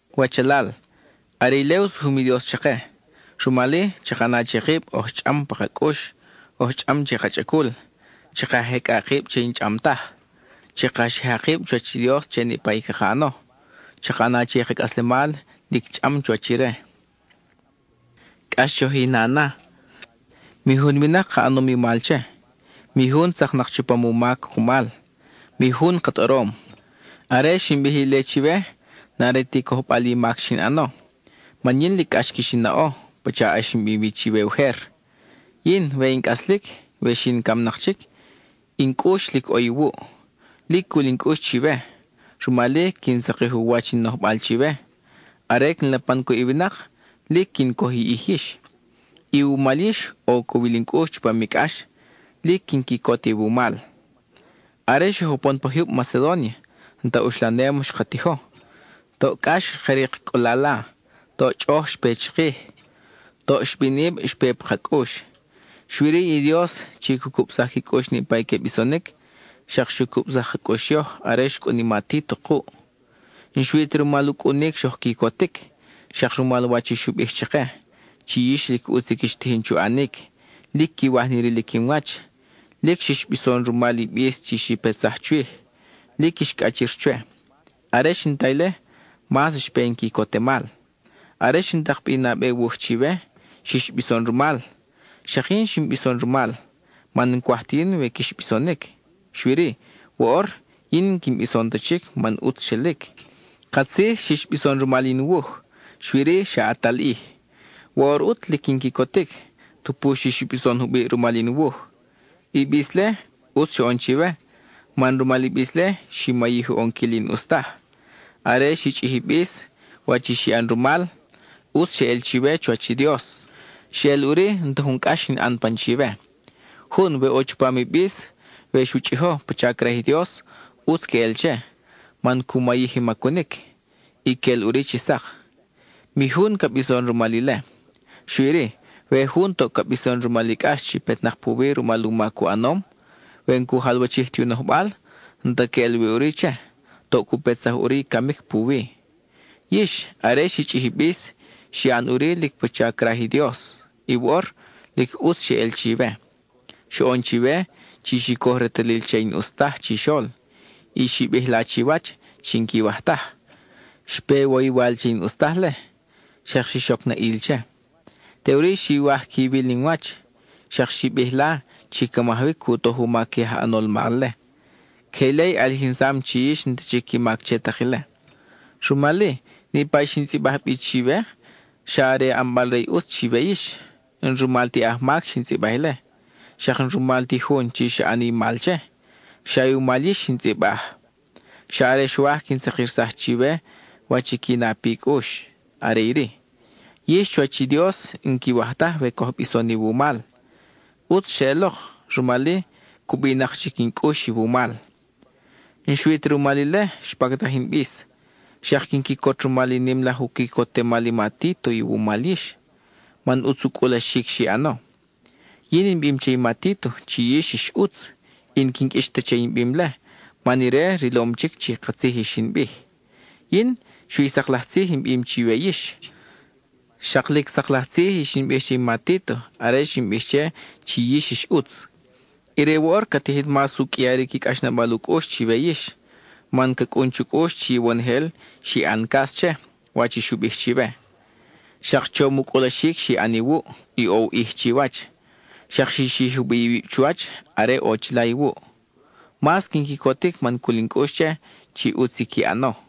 Wachalal, are ile u sujum i Dios chake. Rumal-i, chaka ʼana che kib oj chʼam pa ka cʼux, oj chʼam che ka chʼacul; chaka jecʼa kib che i n-chʼam taj. Chaka xija kib chuwach i Dios che niʼpa i caka ʼano; chaka ʼana che i ka cʼaslemal lic chʼam chuwach ire. Cʼax choj i na na. Mi jun winak ka ʼanom i mal che, mi jun tzaknak chupam u mac kumal, mi jun ka tʼorom. Are xin bij ile chiwe, n-are ti cojbal i mac xin ʼano, man lic cʼax quix in naʼo, pacha ʼax in bim wi chiwe ujer. Yin, we in cʼaslic, we xi in camnak chic, in cʼux lic ʼo iwuʼ. Lic cul in cʼux chiwe, rumal-i quin sakij u wach in nojbal chiwe; are quin lapan cuʼ i winak, lic quin coj i ʼij yix. Iwumal yix, ʼo u cowil in cʼux chupam i cʼax; lic quin quicot iwumal. Are xoj upon pa jyub Macedónia, n-ta uxlanem xka tijo; toʼ cʼax xka rik cʼulala, toʼ chʼoʼoj xpe chikij, toʼ xibinʼib xpe pa ka cʼux. Xui-ri i Dios, chi cu cubsaj qui cʼux niʼpa i que bisonic, xak xu cubsaj ka cʼux yoj are xcʼun i ma Títo kuʼ. N-xui ta rumal u cʼunic xoj quicotic, xak rumal wach i xu bij chake, chi yix lic ʼutz i quix tijin chu ʼanic, lic quiwaj ni rilic in wach, lic xix bison rumal i bis chi xi petsaj chwij, lic quix cʼachir chwe. Are xin ta ile, mas xpe in quicotemal. Are xin tak bi i nabe wuj chiwe, xix bison rumal; xak yin xin bison rumal, man n-cwaj ta yin we quix bisonic. Xui-ri, woʼor yin n-quin bison ta chic man ʼutz xelic. Katzij xix bison rumal in wuj, xui-ri, xa ʼatal ʼij. Woʼor ʼut, lic quin quicotic; tupu xix bison jubiʼ rumal in wuj, i bis-le, ʼutz xoʼon chiwe, man rumal i bis-le, xi mayij u ʼonquil i n-ʼus taj. Are xi chʼij i bis, wach i xi ʼan rumal, ʼutz xeʼel chiwe chuwach i Dios. Xeʼel ʼuri n-ta jun cʼax xin ʼan pan chiwe. Jun, we ʼo chupam i bis, we xu chʼijo pacha craj i Dios, ʼutz queʼel che, man cu mayij i macunic, y quel ʼuri chi sak. Mi jun ca bison rumal ile. Xui-ri, we jun toʼ ca bison rumal i cʼax chi petnak puwi rumal u mac u ʼanom, we n-cu jalwachij ti u nojbal, n-ta queʼel wi ʼuri che; toʼ cu petsaj ʼuri i camic puwi. Yix, are xi chʼij i bis, xi ʼan ʼuri lic pacha craj i Dios, y woʼor ¡lic ʼutz xeʼel chiwe! Xoʼon chiwe, chi xi coj retalil che i n-ʼus taj chixol, y xi bij la chiwach chi n-quiwaj taj. Xpe iwoywal che i n-ʼus taj-le, xak xix oc na ʼil che. Teʼuri xiwaj quiwil ni in wach, xak xi bij la chi ca majawic cu toj u mac i aj ʼanol mal-le. Queje ile i ʼalijinsam chi yix n-ta chic i mac che tak ile. Rumal-i, niʼpa i xin tzʼibaj bi chiwe xa are ʼanbal re i ʼutz chiwe yix. N-rumal ti ajmac xin tzʼibaj ile, xak n-rumal ti i jun chi xa ʼan i mal che, xa iwumal yix xin tzʼibaj. Xa are xwaj quin sakirsaj chiwe wach qui na pi cʼux, are iri: yix chuwach i Dios n-quiwaj taj we coj bison iwumal. ʼUtz xeʼelok, rumal-i, cubinak chic in cʼux iwumal. N-xui ta rumal ile xpactaj in bis, xak quin quicot rumal i nim laj u quicotemal i ma Títo iwumal yix, man ʼutz u cʼulaxic xi ʼano. Yin in bim che i ma Títo chi yix ix ʼutz, y n-quin qʼuix ta che in bim-le, man ire rilom chic chi katzij i xin bij. Yin, xui i sak laj tzij in bim chiwe yix, xak lic sak laj tzij i xin bij che i ma Títo are xin bij che chi yix ix ʼutz. Ire woʼor ca tijin mas u qʼuiaric i cʼaxnabal u cʼux chiwe yix, man ca cʼun chu cʼux chi iwonojel xi ʼan cas che, wach xu bij chiwe. Xak chom u cʼulaxic xi ʼan iwuʼ; ʼo u ʼij chiwach; xak xi xij jubiʼ iwib chuwach, are ʼo chila iwuʼ. Mas quin quicotic man cul in cʼux che, chi ʼutz i qui ʼano.